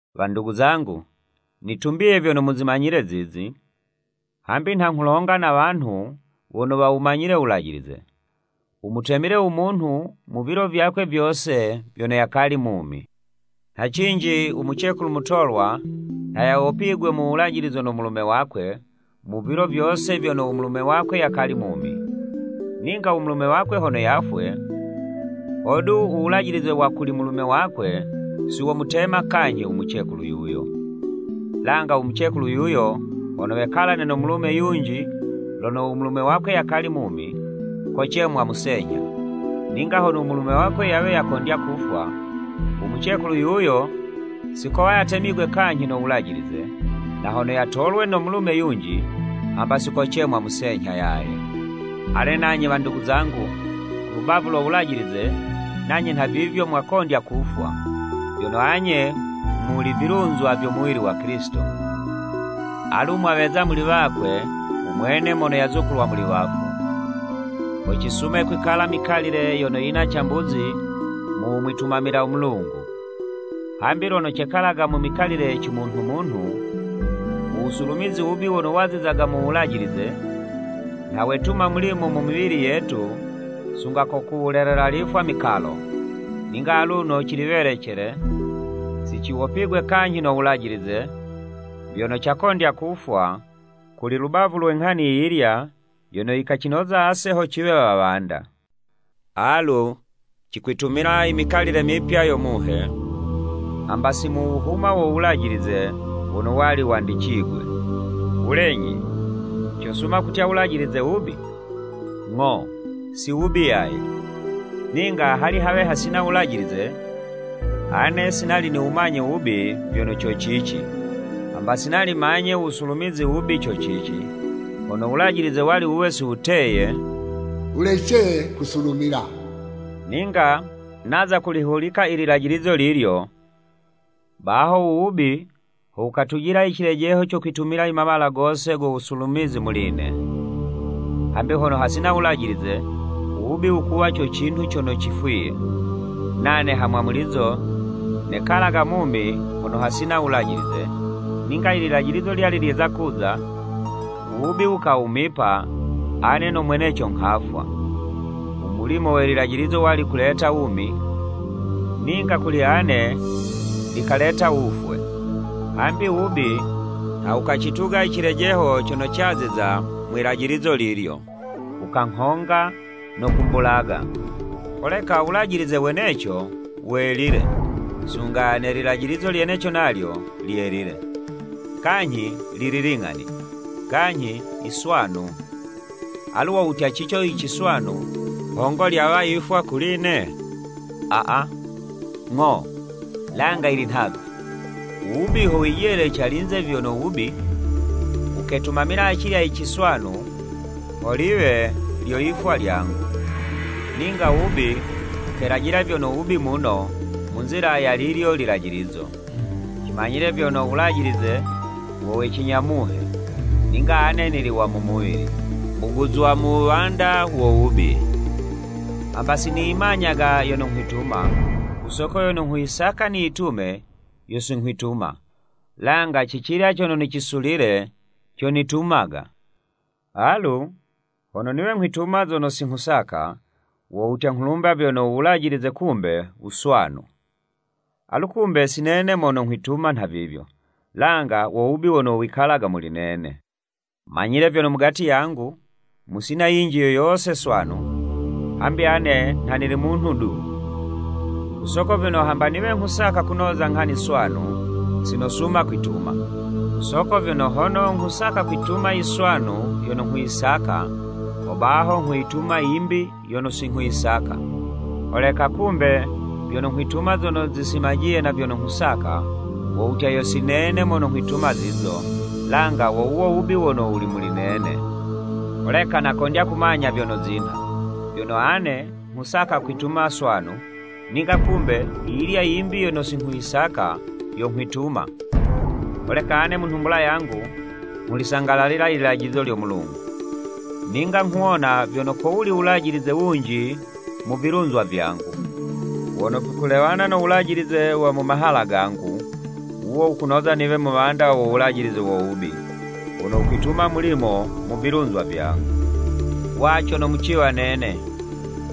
Wandugu zangu, nitumbiye vyono muzimanyile zizi, hambi nha nghulonga na wanhu wono wawumanyile wulajilize. Vyono u Wulajilize, wumutemile u munhu, mu vilo vyakwe vyose vyono yakali mumi. Nha cinji, u mucekulu mutolwa, nha yawopigwe mu wulajilize no mulume wakwe, mu vilo vyose vyono u mulume wakwe yakali mumi, ninga u mulume wakwe hono yafwe, hodu u wulajilize wa kuli mulume wakwe si womutema kanyhi u mucekulu yuyo. Langa umucekulu yuyo hono wekalane no mulume yunji lono umulume wakwe yakali mumi, kocemwa musenyha, ninga hono umulume wakwe yawe yakondya kufwa, umucekulu yuyo si kowa yatemigwe kanyhi no wulajilize, na hono yatolwe no mulume yunji, hamba si kocemwa musenyha yaye. Ale nanye wandugu zangu, ku lubavu lo Wulajilize, nanye nhavivyo mwakondya kufwa, vyono anye muli vilunzwa vyo muwili wa Kilisito, alu mwaweza muli wakwe, u mwene mono yazukulwa muli wafu, ho cisume kwikala imikalile yono yina cambuzi mu wu mwitumamila u Mulungu. Hambi lono cekalaga mu mikalile ye cimunhu-munhu, uwusulumizi wubi wono wazizaga mu Wulajilize, nha wetuma mulimo mu miwili yetu sunga ko ku wulelela lifwa mikalo. Ninga aluno cili welecele, si ciwopigwe kanyhi no Wulajilize, vyono cakondya kufwa kuli lubavu lwe nghani yiyilya yono yikacinoza ase ho ciwe wawanda. Alu cikwitumila imikalile mipya yo Muhe, hamba si mu wuhuma wo Wulajilize wono wali wandicigwe. Wulenyi, cosuma kutya Wulajilize, wubi? Ng'o si wubi yaye! Ninga hali hawe hasina Wulajilize, ane si nali niwumanye wubi vyono co cici. Hamba si nali manye u wusulumizi wubi co cici, hono Wulajilize wali wuwe si wuteye, “Wulece kusulumila.” Ninga naza kulihulika ililajilizo lilyo, baho uwubi ho wukatujila icilejeho co kwitumila imawala gose go wusulumizi muli'ne. Hambi hono hasina Wulajilize, u wubi wukuwa co cinhu cono cifwiye, nane ha mwamulizo, nekalaga mumi hono hasina Wulajilize, ninga ililajilizo lyali lyeza kuza, uwubi wukawumipa, ane no mweneco nghafwa. U mulimo we lilajilizo wali kuleta wumi, ninga kuli ane likaleta wufwe. Hambi wubi nha wukacituga icilejeho cono caziza mwilajilizo lilyo, wukanghonga no kumbulaga. Holeka Wulajilize weneco welile, sunga ne lilajilizo lyeneco nalyo lyelile, kanyhi lili ling'ani, kanyhi, yiswanu. Alu wo wutya, cico iciswanu, hongo lyawa yifwa kuli'ne? Aa, ng'o, langa yili nhavi, uwubi ho wijele calinze vyono wubi, wuketumamila acilya iciswanu ho liwe lyo yifwa lyangu. Ninga uwubi wukelajila vyono wubi muno, mu nzila ya lilyo ililajilizo. Cimanyile vyono, Wulajilize wo we cinya muhe, ninga ane nili wa mu muwili, muguzwa mu wuwanda wo wubi. Hamba si niyimanyaga yono nghwituma, ku soko yono nghuyisaka niyitume, yo si nghwituma, langa cicilya cono nicisulile, co nitumaga. Alu, hono niwe nghwituma zono si nghuzisaka, wo wutya, nghulumba vyono u Wulajilize kumbe wuswanu. Alu kumbe si nene mono nghwituma nhavivyo, langa wo wubi wono wikalaga muli nene. Manyile vyono mugati yangu, musina yinji yo yose swanu, hambi ane nha nili munhu du. Ku soko vyono, hamba niwe nghusaka kunoza nghani swanu, si nosuma kwituma. Ku soko vyono hono, nghusaka kwituma yiswanu yono nghuyisaka, hobaho nghuyituma yimbi yono si nghuyisaka. Holeka kumbe vyono nghwituma zono zisimajiye na vyono nghusaka, wo wutya yo si nene mono nghwituma zizo, langa wo wuwo wubi wono wuli muli nene. Holeka nakondya kumanya vyono zinha, vyono ane nghusaka kwituma swanu, ninga kumbe yiyilya yimbi yono si nghuyisaka, yo nghwituma. Holeka ane mu nhumbula yangu, nghulisangalila ililajilizo lyo Mulungu. Ninga nghuwona, vyono ko wuli wulajilize wunji mu vilunzwa vyangu, wono vikulewana no wulajilize wa mu mahala gangu, wuwo wukunoza niwe muwanda wo wulajilize wo wubi, wono wukwituma mulimo mu vilunzwa vyangu. Waco no muciwa nene!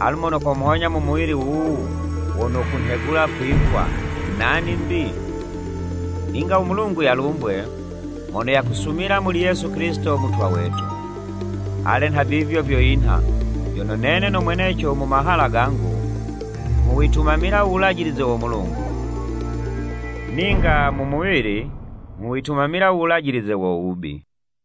Alu mono komhonya mu muwili wuwu wono wukunhegula kwifwa, nani mbi? Ninga, u Mulungu yalumbwe, mono yakusumila, muli Yesu Kilisito Mutwa wetu. Ale nhavivyo vyo ninha, vyono nene no mweneco mu mahala gangu, nghuwitumamila u Wulajilize wo Mulungu, ninga mu muwili, nghuwitumamila u wulajilize wo wubi.